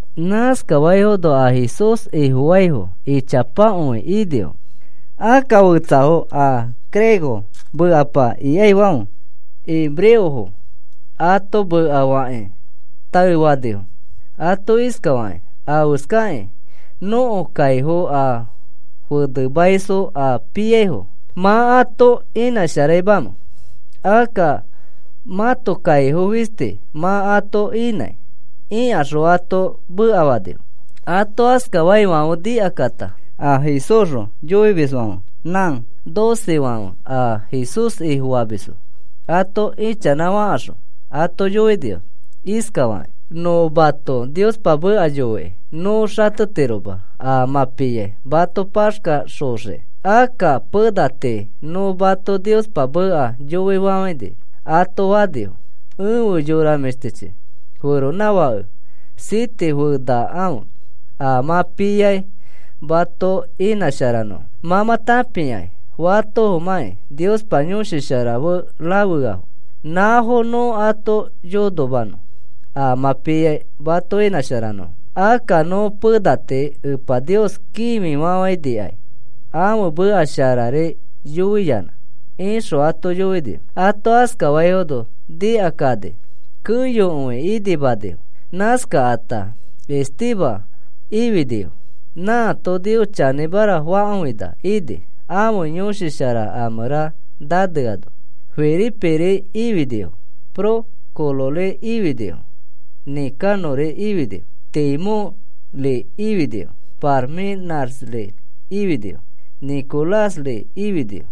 Nãskaifono a Jesús Ifofaifo ichapakõi inifo. Akka fetsafo a griego mekapa ikaifãfe, hebreofo ato mekafakakĩ taefanifo ato iskafakakĩ: “¿Afeskakĩ nõko kaifo a fenemaisfo a piaifo mã ato inãsharaimamẽ? Akka mãto kaifo fisti mã ato inãi,” ikaxõ ato mekafanifo. Ato askafaifãfe nikakata a Jesúsxõ yoimisfãfe nã docefãfe a Jesús Ifofamisfo ato ichanãfakaxõ ato yoinifo iskafakakĩ: “Nõ mato Niospa meka yoikĩ nõ xatetiroma a ma piai mato paxkaxoxiki. Akka pena tii nõ mato Niospa meka yoifafãini,” ato fanifo. “Efe yora mĩshtichi, feronãfakefo siete fenakãfe a mã piai mato inãsharanõfo. Mã mã tãpiakĩ fatofomãkĩ Niospa Yõshi Shara fe rafeafo. Nãfo nõ ato yonomanõ a mã piai mato inãsharanõfo. Akka nõ pena tii Epa Nios kĩfifafãinikai, ãfe meka sharari yoiyanã,” ixõ ato yoinifo. Ato askafaifono nikakani keyokõi inimanifo. Nãskakata Esteban ifinifo, nãato Nios chanĩmara fakõina ini, ãfe Yõshi Shara a mẽra naneano. Feliperi ifinifo, Prócorori ifinifo, Nicanori ifinifo, Timónri ifinifo, Parmenasri ifinifo, Nicolásri ifinifo.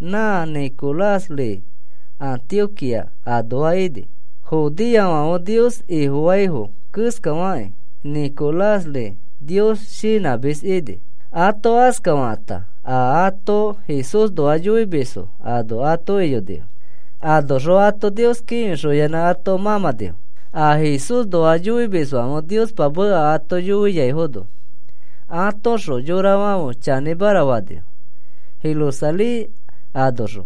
Nã Nicolás Antioquía anoa ini. Judeofãfe Nios Ifofaifo keskafakĩ Nicolás Nios shinãmis ini. Ato askafakãta a ato Jesúsnoa yoimisfo ano ato iyonifo. Anoxõ ato Nios kĩfixoyanã ato mãmãnifo. A Jesúsxõ yoimisfãfe Niospa meka ato yoiaifono atoõxõ yorafãfe chanĩmara fanifo, Jerusalén anoxõ.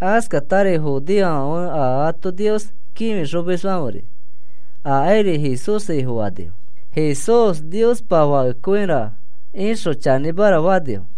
Askatari judeofãfe a ato Nios kĩfixomisfãferi akairi Jesús Ifofanifo. “Jesús Niospa Fakekõira,” ixõ chanĩmara fanifo.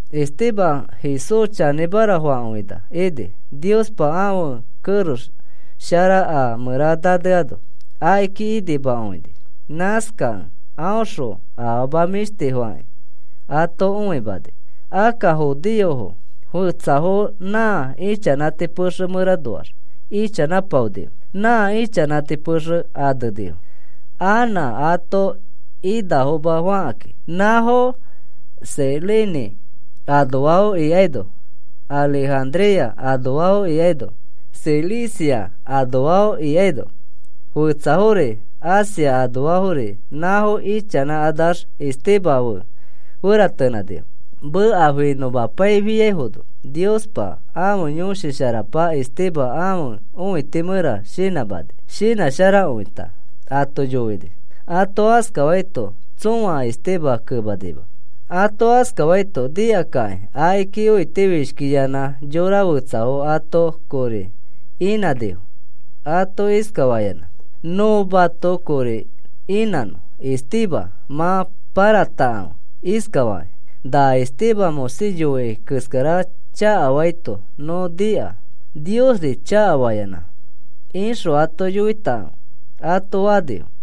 Esteban Jesús chanĩmara fakõina ini. Niospa ãfe kerex shara a mẽra naneano akiki inimakõini. Nãskakẽ aõxõ afama mĩshtifofakĩ ato õimani. Akka judeofo fetsafo nã ichanãti pexe mẽranoax ichanãpaonifo. Nã ichanãti pexe anenifo: “Anã Ato Inafoma,” fakakĩ. Nãfo Cirene anoafo ikaino Alejandría anoafo ikaino Cilicia anoafo ikaino fetsafori Asia anoafori nãfo ichanãkanax Esteban fe feratenãnifo. Meka finõmapaifiaifono Niospa ãfe Yõshi Sharapa Esteban ãfe õiti mẽra shinãmani. Shinãsharakõita ato yoini. Ato askafaito tsõa Esteban kemanima. Ato askafaito nikakakĩ akiki õitifishkiyanã yora fetsafo ato kori inãnifo ato iskafayanã: “Nõ mato kori inãnõ Esteban mã pãratakãfe iskafakĩ: ‘Na Esteban Moisés yoini keskara chakafaito nõ nika, Niosri chakafayanã,’ ixõ ato yoitakãfe,” ato fanifo.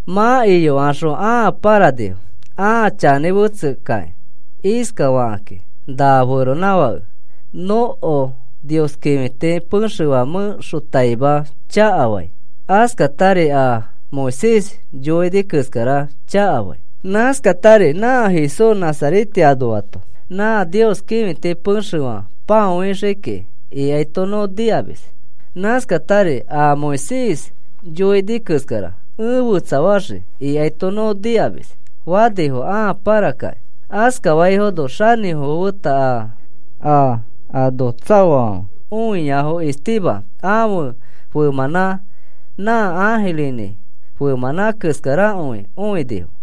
Mã iyokaxõ ãa pãranifo ãa chanĩ fetsekakĩ iskafakakĩ: “Na feronãfãke nõko Nios kĩfiti pexefã mẽxotaima chakafai, askatari a Moisés yoini keskara chakafai. Nãskatari, ‘Nã Jesús Nazarete anoato nã Nios kĩfiti pexefã pãoaxii kiki,’ ikaito nõ nikamis. Nãskatari, ‘A Moisés yoini keskara ẽ fetsafaxii,’ ikaito nõ nikamis,” fanifo ãa pãrakakĩ. Askafaifono xanĩfofo feta a ano tsaoafãfe õiafo Esteban ãfe femãnã nã ãjirinĩ femãnã keskarakõi õinifo.